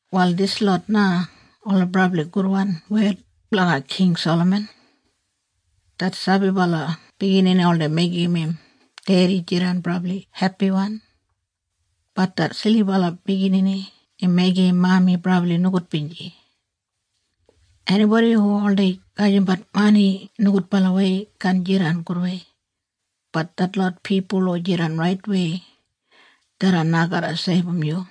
Wal dislot na ola brabli gudwan wed blanga King Salaman. Det sabibala biginini oldei meigim im dedi jidan brabli hepiwan, bat det silibala biginini im meigim im mami brabli nogudbinji. Enibodi hu oldei gajimbat mani nogudbalawei kaan jidan gudwei, bat detlot pipul hu jidan raitwei, tharran na garra seibum yu.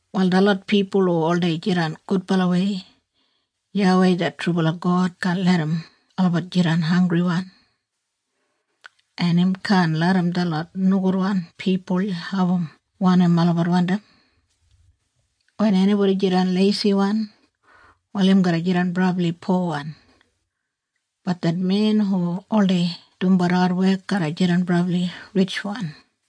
Wal detlot pipul hu oldei jidan gudbalawei, YAWEI det trubala God kaan larram olabat jidan hanggriwan. En im kaan larram detlot nogudwan pipul abum wanim olabat wandim. Wen enibodi jidan leisiwan wal im garra jidan brabli powan, bat det men hu oldei dumbat adwek garra jidan brabli ritjwan.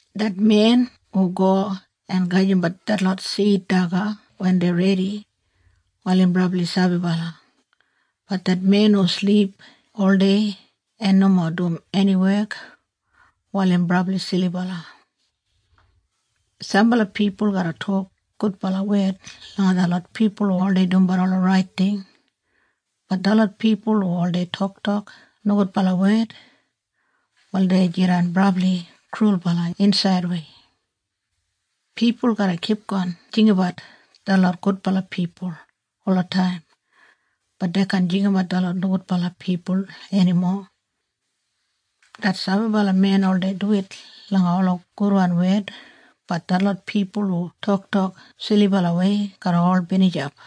Det men hu go en gajimbat detlot sid daga wen dei redi, wal im brabli sabibala, bat det men hu silip oldei en nomo dum eni wek, wal im brabli silibala. Sambala pipul garra tok gudbala wed langa detlot pipul hu oldei dumbat ola rait ting bat detlot pipul hu oldei toktok nogudbala wed, wal dei jidan brabli krulbala insaidwei. Pipul garra kipgon jinggabat detlot gudbala pipul olataim, bat dei kaan jinggabat detlot nogudbala pipul enimo. Det sabibala men oldei duwit langa ola gudwan wed, bat detlot pipul hu toktok silibalawei garra ol binijap.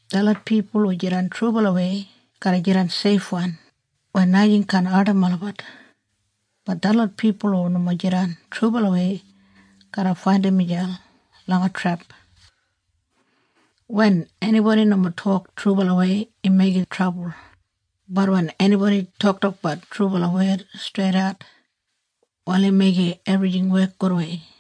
Detlot pipul hu jidan trubalawei garra jidan seifwan weya najing kaan ardim olabat, bat detlot pipul hu nomo jidan trubalawei garra faindim miselp langa trep. Wen enibodi nomo tok trubalawei im meigim trabul, bat wen enibodi toktokbat trubala wed streidat, wal im meigim ebrijing wek gudwei.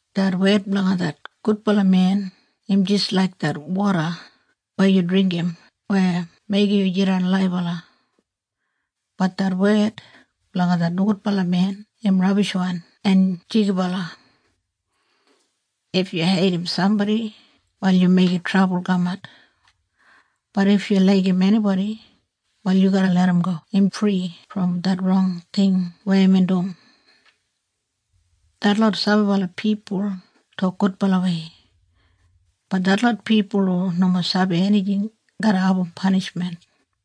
Det wed blanga det gudbala men im jis laik det woda weya yu dringgim weya meigim yu jidan laibala, bat det wed blanga det nogudbala men im rabishwan en jigibala. If yu heidim sambodi wal yu meigim trabul kamat, bat if yu laigim enibodi wal yu garra larramgo im fri brom det rong ting weya imbin dum. Detlot sabibala pipul tok gudbalawei, bat detlot pipul hu nomo sabi enijing garra abum panishmen.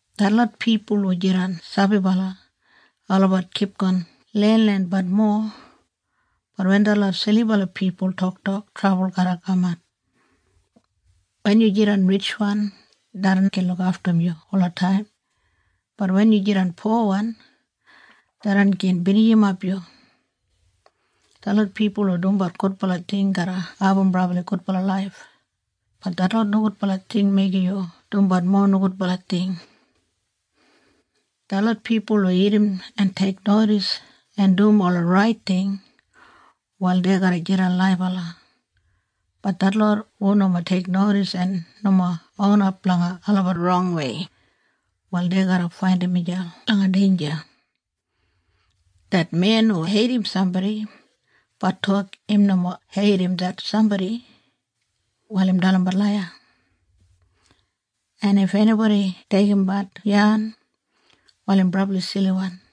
Detlot pipul hu jidan sabibala, olabat kipgon lenlenbat mowa, bat wen detlot silibala pipul toktok trabul garra kaman. Wen yu jidan ritjwan, tharran gin lukaftum yu olataim, bat wen yu jidan powan, tharran gin binijimap yu. Detlot pipul hu dumbat gudbala ting garra abum brabli gudbala laif, bat detlot nogudbala ting meigim yu dumbat mowa nogudbala ting. Detlot pipul hu irrim en teiknodis en dum ola rait ting, wal dei garra jidan laibala, bat detlot hu nomo teiknodis en nomo onap blanga olabat rongwei, wal dei garra faindim miselp langa deinja. Det men hu heidim sambodi bat tok im nomo heidim det sambodi, wal im dalimbat laiya. En if enibodi deigimbat yan, wal im brabli siliwan.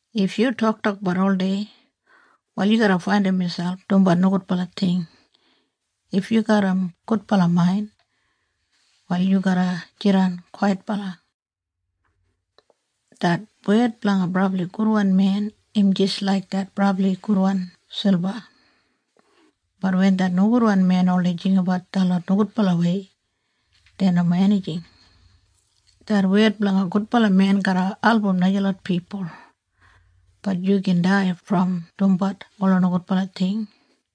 If yu toktokbat oldei, wal yu garra faindim miselp dumbat nogudbala ting. If yu garram gudbala main, wal yu garra jidan kwaitbala. Det wed blanga brabli gudwan men im jis laik det brabli gudwan silba, bat wen det nogudwan men oldei jinggabat detlot nogudbalawei dei nomo enijing. Det wed blanga gudbala men garra album najalot pipul, bat yu gin dai brom dumbat ola nogudbala ting.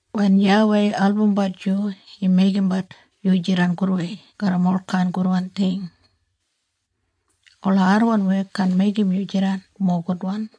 Wen YAWEI albumbat yu im meigimbat yu jidan gudwei garram olkain gudwan ting. Ola adwan wek kaan meigim yu jidan mowa gudwan.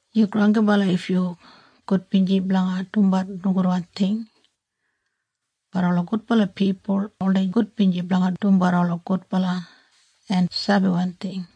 Yu granggibala if yu gudbinji blanga dumbat nogudwan ting, bat ola gudbala pipul oldei gudbinji blanga dumbat ola gudbala en sabiwan ting.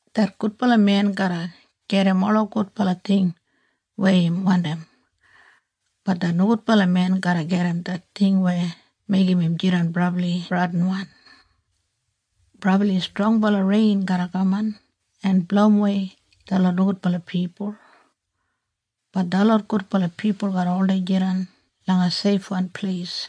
Det gudbala men garra gedim ola gudbala ting weya im wandim, bat det nogudbala men garra gedim det ting weya meigim im jidan brabli bradinwan. Brabli strongbala rein garra kaman en blowimwei detlot nogudbala pipul, bat detlot gudbala pipul garra oldei jidan langa seifwan pleis.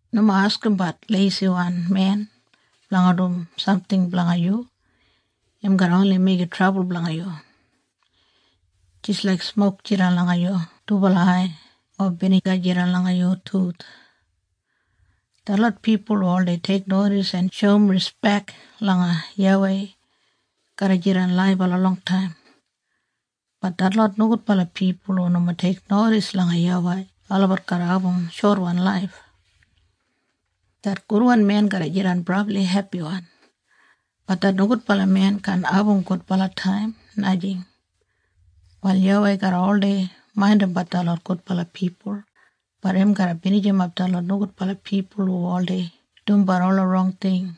Nomo askimbat leisiwan men blanga dum samting blanga yu. Im garra oni meigim trabul blanga yu, jis laik smok jidan langa yu dubala ai o biniga jidan langa yu tuth. Detlot pipul hu oldei teiknodis en shoum rispek langa YAWEI garra jidan laibala longtaim, bat detlot nogudbala pipul hu nomo teiknodis langa YAWEI olabat garra abum shotwan laif. Det gudwan men garra jidan brabli hepiwan, bat det nogudbala men kaan abum gudbala taim, najing. Wal YAWEI garra oldei maindimbat detlot gudbala pipul, bat im garra binijimap detlot nogudbala pipul hu oldei dumbat ola rong ting.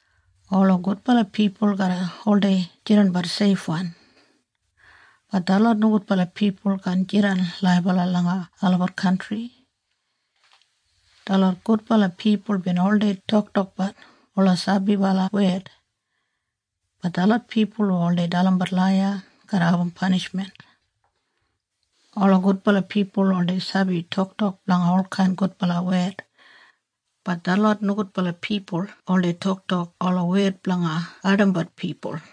Ola gudbala pipul garra oldei jidanbat seifwan, bat detlot nogudbala pipul kaan jidan laibala langa olabat kantri. Detlot gudbala pipul bin oldei toktokbat ola sabibala wed, bat detlot pipul hu oldei dalimbat laiya garra abum panishmen. Ola gudbala pipul oldei sabi toktok blanga olkain gudbala wed, bat detlot nogudbala pipul oldei toktok ola wed blanga ardimbat pipul.